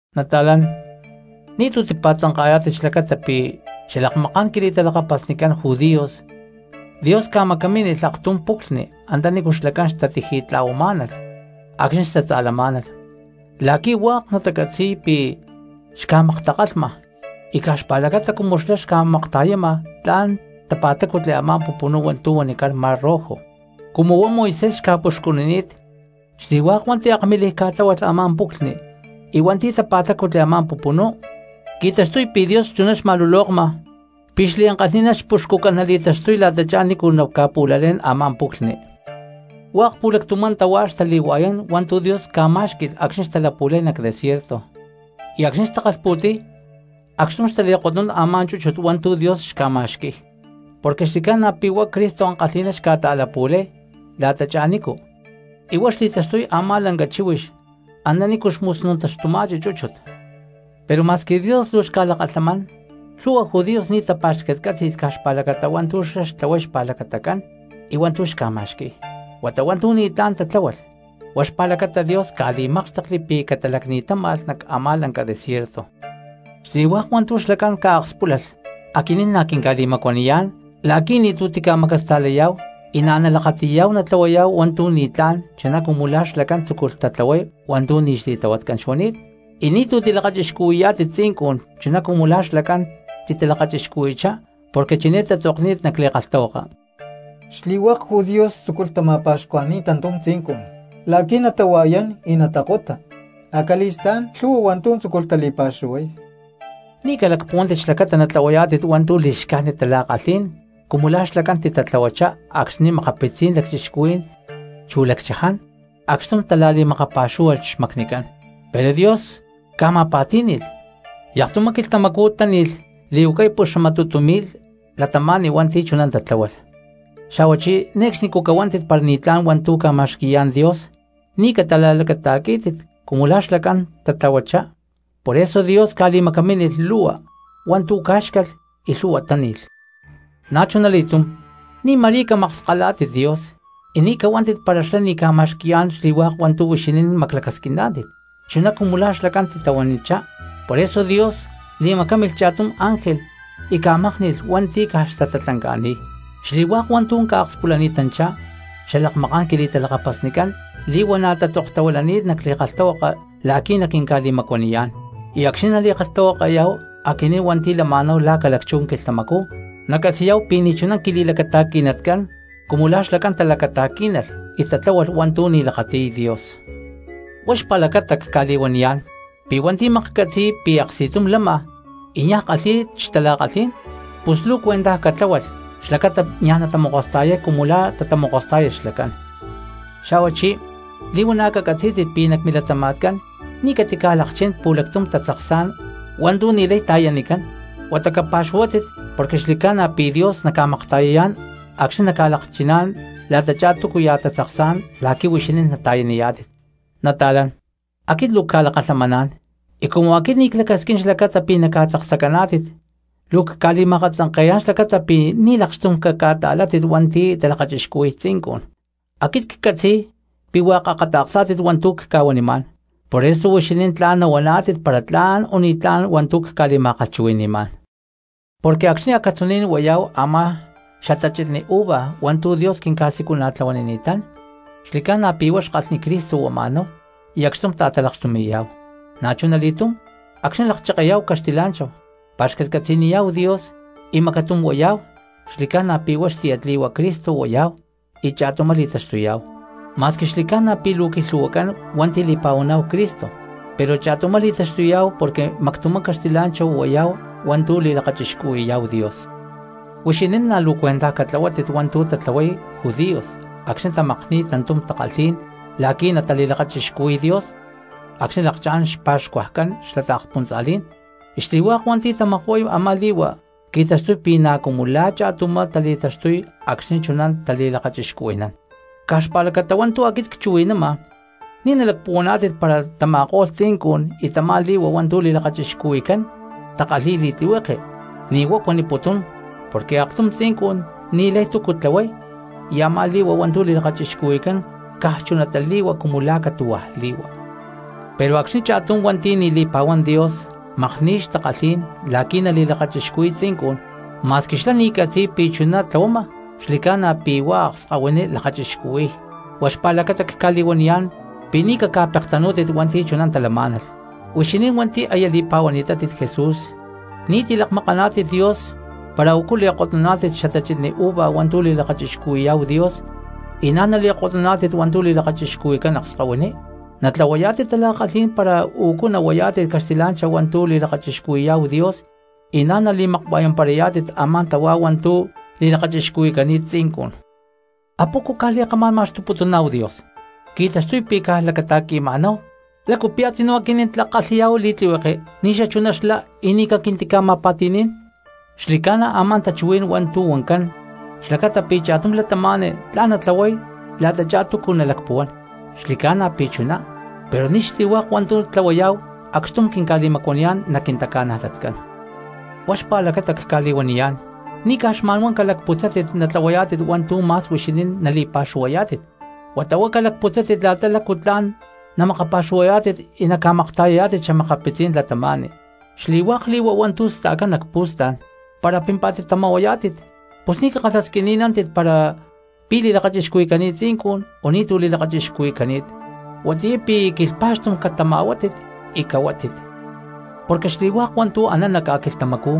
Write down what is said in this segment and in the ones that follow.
Nata̠lán, ni̠tu̠ tipa̠tzanka̠yá̠tit xlacata pi̠ xalakmaká̠n quili̠talakapasnicán judíos, Dios ca̠macamínilh aktum puclhni antanícu xlacán xtatiji̠tla̠huamá̠nalh acxni̠ xtatza̠lamá̠nalh, la̠qui̠ hua̠k natacatzi̠y pi̠ xca̠maktakalhma, y caj xpa̠lacata cumu xlá xca̠makta̠yama tla̠n tapa̠tácutli a̠má pupunú hua̠ntu̠ huanicán Mar Rojo. Cumu huá Moisés xca̠puxcunini̠t xli̠hua̠k hua̠nti̠ akmilij ca̠tláhualh a̠má puclhni y hua̠nti̠ tapa̠tácutli a̠má pupunú, qui̠taxtuy pi̠ Dios chuná xli̠ma̠lulokma pi̠ chú xlá xliankalhi̠ná xpuxcucán nali̠taxtuy la̠tachá nícu naca̠pu̠lalé̠n a̠má puclhni. Hua̠k pu̠lactumá tahuá xtali̠hua̠yán hua̠ntu̠ Dios ca̠má̠xqui̠lh acxni̠ xtalapu̠lay nac desierto. Y acxni̠ xtakalhpu̠ti̠y acxtum xtali̠kotnún a̠má chúchut hua̠ntu̠ Dios xca̠ma̠xqui̠y, porque xli̠ca̠na pi̠ huá Cristo ankalhi̠ná xca̠ta̠lapu̠lay la̠tachá nícu y huá xli̠taxtuy a̠má lanca chíhuix antanícu xmusnuntaxtuma̠chi chúchut. Pero ma̠squi Dios luu xca̠lakalhamán lhu̠hua judíos ni̠ tapa̠xcatcatzí̠nilh caj xpa̠lacata hua̠ntu̠ xlá xtlahuay xpa̠lacatacán y hua̠ntu̠ xca̠ma̠xqui̠y, huata hua̠ntu̠ ni̠tlá̠n tatla̠hualh, huá xpa̠lacata Dios ca̠li̠mákxtekli pi̠ catalacni̠táma̠lh nac a̠má lanca desierto. Xli̠hua̠k hua̠ntu̠ xlacán ca̠akspúlalh aquinín na̠ quinca̠li̠macuaniyá̠n la̠qui̠ ni̠tu̠ timacasta̠layá̠hu y na̠ nalakati̠yá̠hu natlahuayá̠hu hua̠ntu̠ ni̠tlá̠n chuná cumu lá xlacán tzúculh tatlahuay hua̠ntu̠ ni̠ xli̠tlahuatcán xuani̠t. Y ni̠tu̠ tilakachixcuhui̠yá̠tit tzincun chuná cumu la̠ xlacán titalakachixcuhui̠chá, porque chiné tatzokni̠t nac li̠kalhtahuaka: “Xli̠hua̠k judíos tzúculh tama̠pa̠xcuajni̠y tantum tzincun la̠qui̠ natahua̠yán y natakota, acali̠stá̠n lhu̠hua hua̠ntu̠ tzúculh tali̠pa̠xuhuay.” Ni̠ calacpuhuántit xlacata natlahuayá̠tit hua̠ntu̠ li̠xcájnit tala̠kalhí̠n cumu la̠ xlacán titatlahuachá acxni̠ makapitzí̠n lacchixcuhuí̠n chu lacchaján acxtum tala̠li̠makapa̠xúhualh xmacnicán, pero Dios ca̠ma̠pa̠tí̠ni̠lh y aktumá quilhtamacú táni̠lh li̠huacay puxamatutu mi̠lh cristianos hua̠nti̠ chuná tatláhualh. Xa̠huachí ne̠cxnicú cahuántit para ni̠tlá̠n hua̠ntu̠ ca̠ma̠xqui̠yá̠n Dios ni̠ cata̠la̠lacata̠quí̠tit cumu la̠ xlacán tatatlahuachá, poreso Dios ca̠li̠macamínilh lu̠hua hua̠ntu̠ cá̠xcalh y lhu̠hua táni̠lh. Na̠chunali̠túm ni̠ ma̠rí camakskalátit Dios y ni̠ cahuántit para xlá ni̠ ca̠ma̠xqui̠yá̠n xli̠hua̠k hua̠ntu̠ huixinín maclacasquiná̠tit chuná cumu la̠ xlacán titala̠huanichá, por eso Dios li̠macámilh cha̠tum ángel y ca̠mákni̠lh hua̠nti̠ caj xtatatlanca̠ni̠y. Xli̠hua̠k hua̠ntu̠ ca̠akspulani̠tanchá xalakmaká̠n quili̠talakapasnicán li̠huana̠ tzokuili̠cani̠t nac li̠kalhtahuaka la̠qui̠ naquinca̠li̠macuaniyá̠n, y acxni̠ nali̠kalhtahuakayá̠hu aquinín hua̠nti̠ lama̠náhu la̠ ca̠lacchú quilhtamacú nacatzi̠yá̠hu pi̠ ni̠ chuná quili̠lacata̠qui̠natcán cumu la̠ xlacán talacata̠quí̠nalh y tatlahualh hua̠ntu̠ ni̠ lakáti̠lh Dios. Huá xpa̠lacata cca̠li̠huaniyá̠n pi̠ hua̠nti̠ maklhcatzi̠y pi̠ aksti̠tum lama y niaj kalhi̠y xtala̠kalhí̠n, pus luu cuentaj catlahuátit xlacata niaj natamokosta̠yay cumu la̠ tamokostá̠yalh xlacán. Xa̠huachí li̠huana̠ cacatzí̠tit pi̠ nac milatama̠tcán ni̠ catica̠lakchín pu̠lactum tatzaksá̠n hua̠ntu̠ ni̠lay ta̠yanicán, huata capa̠xuhuátit porque xli̠ca̠na pi̠ Dios naca̠makta̠yayá̠n acxní naca̠lakchiná̠n la̠tachá túcuya̠ tatzaksá̠n la̠qui̠ huixinín nata̠yaniyá̠tit. Nata̠lán, aquit luu cca̠lakalhamaná̠n y cumu aquit ni̠ clacasquín xlacata pi̠ naca̠tzaksacaná̠tit luu cca̠li̠ma̠akatzanke̠yá̠n xlacata pi̠ ni̠ lakxtum caca̠ta̠látit hua̠nti̠ talakachixcuhui̠y tzincun. Aquit ccatzi̠y pi̠ hua̠k akata̠ksá̠tit hua̠ntu̠ cca̠huanimá̠n poreso huixinín tla̠n nahuaná̠tit para tla̠n o ni̠tlá̠n hua̠ntu̠ cca̠li̠ma̠kalhchuhui̠ni̠má̠n. Porque acxni̠ acatzuní̠n huayá̠hu a̠má xatachitni uva hua̠ntu̠ Dios quinca̠siculana̠tlahuanini̠tán, xli̠ca̠na pi̠ huá xkalhni Cristo huama̠náhu y acxtum ta̠talakxtumi̠yá̠hu; na̠chuna li̠túm acxni̠ lakchekeyá̠hu caxtilá̠nchahu, pa̠xcatcatzi̠niyá̠hu Dios y macatum huayá̠hu, xli̠ca̠na pi̠ huá xtiyatli̠hua Cristo huayá̠hu y cha̠tumá li̠taxtuyá̠hu. Ma̠squi xli̠ca̠na pi̠ luu quilhu̠huacán hua̠nti̠ li̠pa̠huaná̠hu Cristo pero cha̠tumá li̠taxtuyá̠hu porque mactumá caxtilá̠nchahu huayá̠hu hua̠ntu̠ li̠lakachixcuhui̠yá̠hu Dios. Huixinín na̠ luu cuentaj catlahuátit hua̠ntu̠ tatlahuay judíos acxni̠ tamakni̠y tantum takalhí̠n la̠qui̠ natali̠lakachixcuhui̠y Dios acxni̠ lakchá̠n xpa̠xcuajcán xla taakspuntza̠lí̠n, y xli̠hua̠k hua̠nti̠ tamakuay a̠má li̠hua qui̠taxtuy pi̠ na̠ cumu la̠ cha̠tumá tali̠taxtuy acxni̠ chuná tali̠lakachixcuhui̠nán. Caj xpa̠lacata hua̠ntu̠ aquit cchuhui̠nama ni̠ nalacpuhuaná̠tit para tama̠ko̠lh tzincun y tamá li̠hua hua̠ntu̠ li̠lakachixcuhui̠cán takalhi̠y li̠tlihueke. Ni̠ huá cuaniputún porque aktum tzincun ni̠lay túcu tlahuay y a̠má li̠hua hua̠ntu̠ li̠lakachixcuhui̠cán caj chunatá li̠hua cumu la̠ catu̠hua̠ li̠hua. Pero acxni̠ cha̠tum cristiano hua̠nti̠ ni̠ li̠pa̠huán Dios makni̠y xtakalhí̠n la̠qui̠ nali̠lakachixcuhui̠y tzincun, ma̠squi xlá ni̠ catzi̠y pi̠ chuná tlahuama xli̠ca̠na pi̠ huá akskahuiní lakachixcuhui̠y, huá xpa̠lacata cca̠li̠huaniyá̠n pi̠ ni̠ caca̠pektanú̠tit hua̠nti̠ chuná talamá̠nalh. Huixinín hua̠nti̠ aya li̠pa̠huaná̠tit Jesús ni̠tu̠ tili̠kama̠naná̠tit Dios para ucu nali̠kotnuná̠tit xatachitni uva hua̠ntu̠ li̠lakachixcuhui̠yá̠hu Dios y na̠ nali̠kotnuná̠tit hua̠ntu̠ li̠lakachixcuhui̠cán akskahuiní. Na̠ tlahuayá̠tit tala̠kalhí̠n para ucu nahuayá̠tit caxtilá̠nchahu hua̠ntu̠ li̠lakachixcuhui̠yá̠hu Dios y na̠ nali̠makua̠yamparayá̠tit a̠má tahuá hua̠ntu̠ li̠lakachixcuhui̠cani̠t tzincun. ¿Apoco caj li̠kamá̠n ma̠xtuputuná̠hu Dios? Qui̠taxtuy pi̠ caj lacata̠qui̠ma̠náhu, ¿lácu pi̠ a̠tzinú aquinín tlak kalhi̠yá̠hu li̠tlihueke ni̠xachuná xlá y ni̠ caquintica̠ma̠pa̠ti̠ní̠n? Xli̠ca̠na a̠má tachuhuí̠n hua̠ntu̠ huancán xlacata pi̠ cha̠tum cristiano tla̠n natlahuay la̠tachá túcu nalacpuhuán. Xli̠ca̠na pi̠ chuná, pero ni̠ xli̠hua̠k hua̠ntu̠ tlahuayá̠hu acxtum quinca̠li̠macuaniyá̠n nac quintaca̠najlatcán. Huá xpa̠lacata cca̠li̠huaniyá̠n, ni̠ caj xma̠nhuá calacputzátit natlahuayá̠tit hua̠ntu̠ ma̠s huixinín napa̠xuhuayá̠tit, huata huá calacputzátit la̠ta lacu tla̠n namakapa̠xuhuayá̠tit y naca̠makta̠yayá̠tit xa̠makapitzí̠n cristianos. Xli̠hua̠k li̠hua hua̠ntu̠ sta̠cán nac pu̠stá̠n para pimpá̠tit tama̠huayá̠tit pus ni̠ cakalhasquini̠nántit para pi̠ li̠lakachixcuhui̠cani̠t tzincun o ni̠tu̠ li̠lakachixcuhui̠cani̠t, huatiyá pi̠ quilhpa̠xtum catama̠huátit y cahuátit. Porque xli̠hua̠k hua̠ntu̠ anán nac ca̠quilhtamacú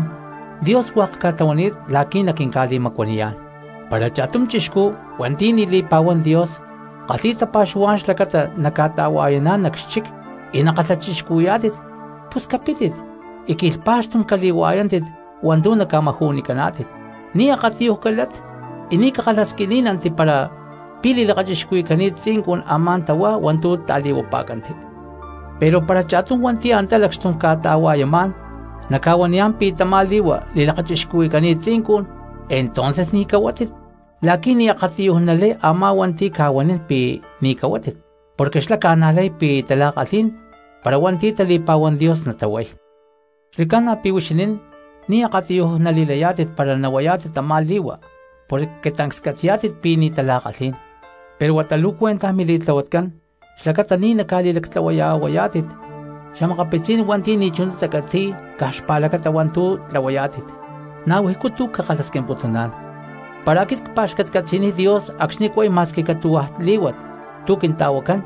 Dios hua̠k ca̠tlahuani̠t la̠qui̠ naquinca̠li̠macuaniyá̠n. Para cha̠tum chixcú hua̠nti̠ ni̠ li̠pa̠huán Dios kalhi̠y tapa̠xuhuá̠n xlacata naca̠ta̠hua̠yaná̠n nac xchic y nakalhachixcuhui̠yá̠tit, pus capítit y quilhpa̠xtum cali̠hua̠yántit hua̠ntu̠ naca̠maju̠nicaná̠tit, ni̠ akatiyuj calát y ni̠ cakalhasquiní̠nanti para pi̠ li̠lakachixcuhui̠cani̠t tzincun a̠má tahuá hua̠ntu̠ ta̠li̠huapá̠canti. Pero para cha̠tum hua̠nti̠ antá lacxtum ca̠ta̠hua̠yamá̠n naca̠huaniyá̠n pi̠ tamá li̠hua li̠lakachixcuhui̠cani̠t tzincun, entonces ni̠ cahuátit la̠qui̠ ni̠ akatiyuj nalay a̠má hua̠nti̠ ca̠huanín pi̠ ni̠ cahuátit porque xlá ca̠najlay pi̠ tala̠kalhí̠n para hua̠nti̠ tali̠pa̠huán Dios natahuay. Xli̠ca̠na pi̠ huixinín ni̠ akatiyuj nali̠layá̠tit para nahuayá̠tit tamá li̠hua porque tancs catzi̠yá̠tit pi̠ ni̠ tala̠kalhí̠n, pero huata luu cuentaj mili̠tlahuatcán xlacata ni̠ naca̠li̠lactlahuaya̠huayá̠tit xa̠makapitzí̠n hua̠nti̠ ni̠chuná tacatzi̠y caj xpa̠lacata hua̠ntu̠ tlahuayá̠tit. Na̠ wijcú tu̠ cca̠kalhasquimputuná̠n: para áquit cpa̠xcatcatzi̠niy Dios acxni cway ma̠squi caxatu̠cawá̠ lí̠wat tu̠ quinta̠wacán,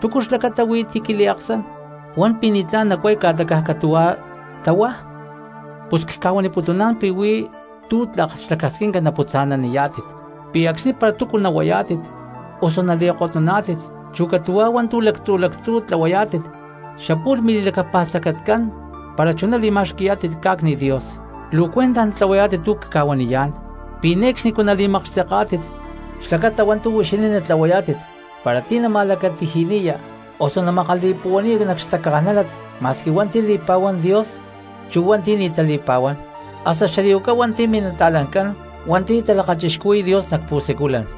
¿túcu xlacata wí ti̠ quintaliaksán, wan pi ni̠ tla̠n chuná nacway caj xatu catuwa líwat? Pus cca̠waniputuná̠n pi̠ wí̠ tu̠ tlak xlacasquinca naputza̠naniya̠w. Wa̠ yumá pi̠ acxni para tú̠ nawayá̠tit, usu nakotá̠tit, chu catu̠wá wántú̠ lactzú̠ lactzú̠ tlawayá̠tit xapú̠lh mili̠lacapa̠stacatcán para chuná nali̠ma̠xqui̠yá̠tit ca̠cni Dios. Luwa cwintaj natlawayá̠tit tu cca̠waniyá̠n pi ni̠uxcxni nali̠makaxtakátit pi caj xlacata wa̠ntú wixín natlawayá̠tit para tí nama̠lacatiji̠niyá usu a̠tuyá nali̠ma̠puwa̠niyá̠tit nac xtacanajla ma̠squi wa̠nti̠ li̠pawán Dios, chu wa̠ntí̠ ni̠ talipawán. Chu hasta xali̠wacá wa̠nti̠ minata̠lani̠ncán ti macxtum lakataquilhputayátit Dios nac siculán.